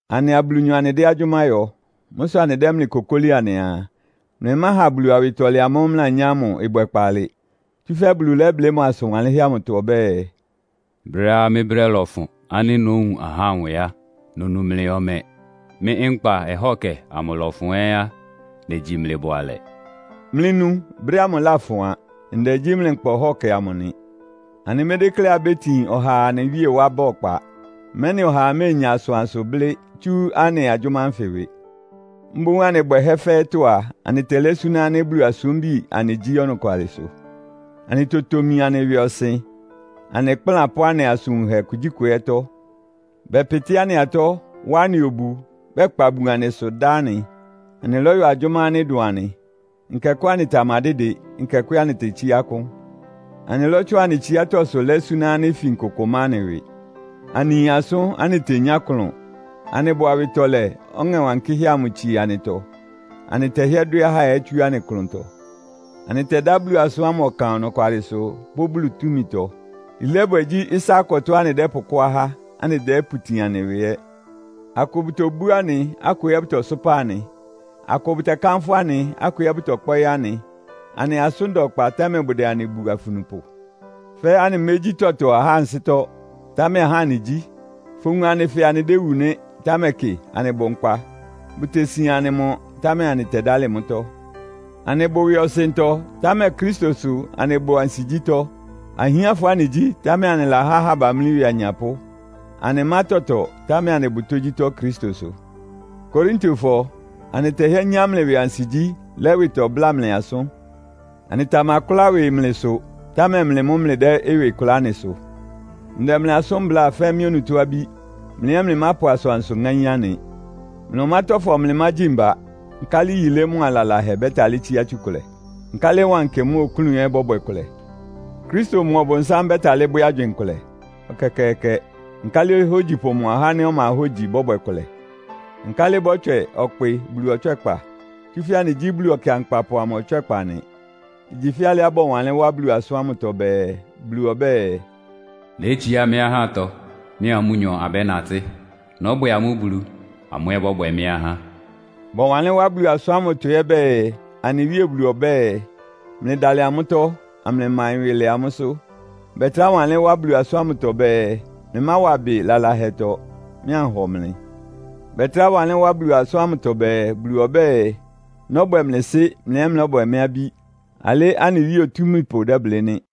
Anɩa Bulunyɔ anɩdɛ́ agyʋ́má yɔ. Mʋ́ sʋ anɩdɛ́ mlɩ kokóli anɩaa, mlɩmáha Bulu awɩtɔlɛ amʋ́ʋ́ mlɩlanyá ámʋ ɩbwɛ kpaalɩ. Tsúfɛ́ Bulu lɛ́blɩ́ mʋ asʋn wanlɩ́nhɛ́ amʋtɔ ɔbɛ́ɛ, “Brɛ́á mɩ́ brɛ́ lɔfʋn ánɩ́ nówun ahá nwɛ a, nonu mlɩ ɔmɛ. Mɩ́ nkpa ɔhɔ́kɛ amʋ ɩlɔfʋn ɛ́ á, negyi mlɩ bʋalɛ.” Mlɩnu! Brɛ́ ámʋ láfʋn a. Ndɛ gyí mlɩ nkpa ɔhɔ́kɛ amʋ nɩ! Anɩmédékléá abétin ɔhaa anɩ Wíe wá ba ɔkpa, mɛ́nɩ ɔhaa méenya asʋansʋ blɩ́ tsú anɩ agyʋ́má ánfɩ ɩwɩ. Mboún anɩ bwɛhɛ́ fɛ́ɛ́tɔ́ a, anɩtɛlɛ́ súná ánɩ́ Bulu asúmbi anɩgyí ɔnɔkwalɩsʋ. Anɩtotomi anɩ ɩwɩɔsɩn, anɩ ɩkplán pʋ́ anɩ asʋn wunhɛ kugyíkʋ ɛ́tɔ́. Bɛpɩtɩ́ anɩ atɔ́, wá anɩ obu, bɛkpa bun anɩsʋ dá anɩ. Anɩlɔ́yɔ agyʋ́má ánɩ́ ɩdʋn anɩ. Nkɛkʋ́ anɩtamadɩ́dɩ, nkɛkʋ́ ɛ́ anɩtetsíá akʋ́n. Anɩlɔ́tsʋn anɩ tsiátɔ́sʋ lɛ́ súná ánɩ́ ifin kʋkʋ má anɩ ɩwɩ. Anɩyin asʋ́n, anɩtenyá ɩklʋn. Anɩbʋ awɩtɔlɛ, Ɔŋɛ Wankɩ́hɛ́ amʋ tsie anɩtɔ. Anɩtɛhɩ́ɛ́ dwɛ́ ahá ɛ́ tsú anɩ klʋntɔ. Anɩtɛdá Bulu asʋ́n ámʋ ɔkan ɔnɔkwalɩsʋ pʋ́ Bulu túmitɔ. Yilébwɛ gyí ɩsá-akɔtɔ́á anɩdɛ́pʋkɔ́ ahá, anɩdɛ́pʋtin anɩ ɩwɩ ɛ́. Akʋ bʋtobú anɩ, akʋ ɛ́ bʋtɔsʋ́pa anɩ. Akʋ bʋtɛkánfʋ́ anɩ, akʋ ɛ́ bʋtɔkpɔ́ɩ́ anɩ. Anɩ asʋ́n da ɔkpa, támɛ bʋdɛ anɩ bu afunupʋ. Fɛ́ anɩmégyí tɔtɔ ahá ansɩ́tɔ́, támɛ ahá anɩgyí. Fowun anɩ fɛɛ anɩdéwu nɩ́, támɛ kɩ, anɩbʋ nkpa. Bʋtesian anɩ mɔ, támɛ anɩtɛdálɩ mʋ́tɔ́. Anɩbʋ ɩwɩɔsɩntɔ, támɛ Kristo sʋ anɩbʋ ansigyítɔ́. Ahiánfɔ anɩgyí, támɛ anɩlahá ahá bamlí ɩwɩ anyapʋ́. Anɩmá tɔtɔ, támɛ anɩbʋ tógyítɔ́ Kristo sʋ. Korintofɔ! Anɩtɛhɩ́ɛ́ nyá mlɩ ɩwɩ ansigyí, lɛ́ ɩwɩtɔ bláa mlɩ asʋ́n. Anɩtamakʋ́lá ɩwɩ mlɩsʋ, támɛ mlɩ mʋ́ mlɩdɛ́ ɩwɩ kʋlá anɩsʋ. Ndɛ mlɩ asʋ́n bláa fɛ́ mɩ́ onutó abí. Mlɩ ɛ́ mlɩmápʋ asʋansʋ ŋáín anɩ. Mlɩa ɔmátɔ́fɔ mlɩmágyi mba. Nkálɩ yilé mʋ́a lalahɛ bɛ́talɩ́ tsíá tsukʋlɛ? Nkálɩ wankɩ mʋ́a oklún ɛ́ bɔ́bwɛ kʋlɛ? Kristo mʋa Ɔbʋnsám bɛ́talɩ́ bwɛ́ agywɩɩn kʋlɛ? Ɛkɛkɛɛkɛ! Nkálɩ ohógyipʋ mʋa ɔhá ánɩ́ ɔma hógyi bɔ́bwɛ kʋlɛ? Nkálɩ bɔ́tswɛ ɔkpɩ Bulu ɔtswɛ́kpa? Tsúfɛ́ anɩgyí Bulu Ɔkɩankpapʋ amʋ ɔtswɛ́kpa nɩ. Igyi fɛ́ alɩá bɔwanlɩ́n wá Bulu asʋ́n ámʋtɔ bɛɛ, “Bulu ɔbɛ́ɛ, ‘Nétsiá mɩ́ ahátɔ, mɩ́a amʋ́nyɔ abɛ́natɩ́. Nɔ́bwɛ amʋ́ Bulu, amʋ́ ɛ́ bɔ́bwɛ mɩ́ ahá.’” Bɔwanlɩ́n wá Bulu asʋ́n ámʋtɔ ɛ́ bɛɛ, “Anɩ Wíe Bulu ɔbɛ́ɛ, ‘Mlɩdalɩ amʋ́tɔ́, amlɩmaɩn ɩwɩ lɛ amʋ́sʋ́.’” Bɛtrá wanlɩ́n wá Bulu asʋ́n ámʋtɔ bɛɛ, “Mlɩmáwa ɩbɩ lalahɛtɔ, mɩ́ anhɔ mlɩ.” Bɛtrá wanlɩ́n wá Bulu asʋ́n ámʋtɔ bɛɛ, “Bulu ɔbɛ́ɛ, ‘Nɔ́bwɛ mlɩ Sɩ́, mlɩ ɛ́ mlɔ́bwɛ mɩ́ abí.’ Alɩ́ anɩ Wíe Otúmípʋ dɛ́blɩ́ nɩ́.”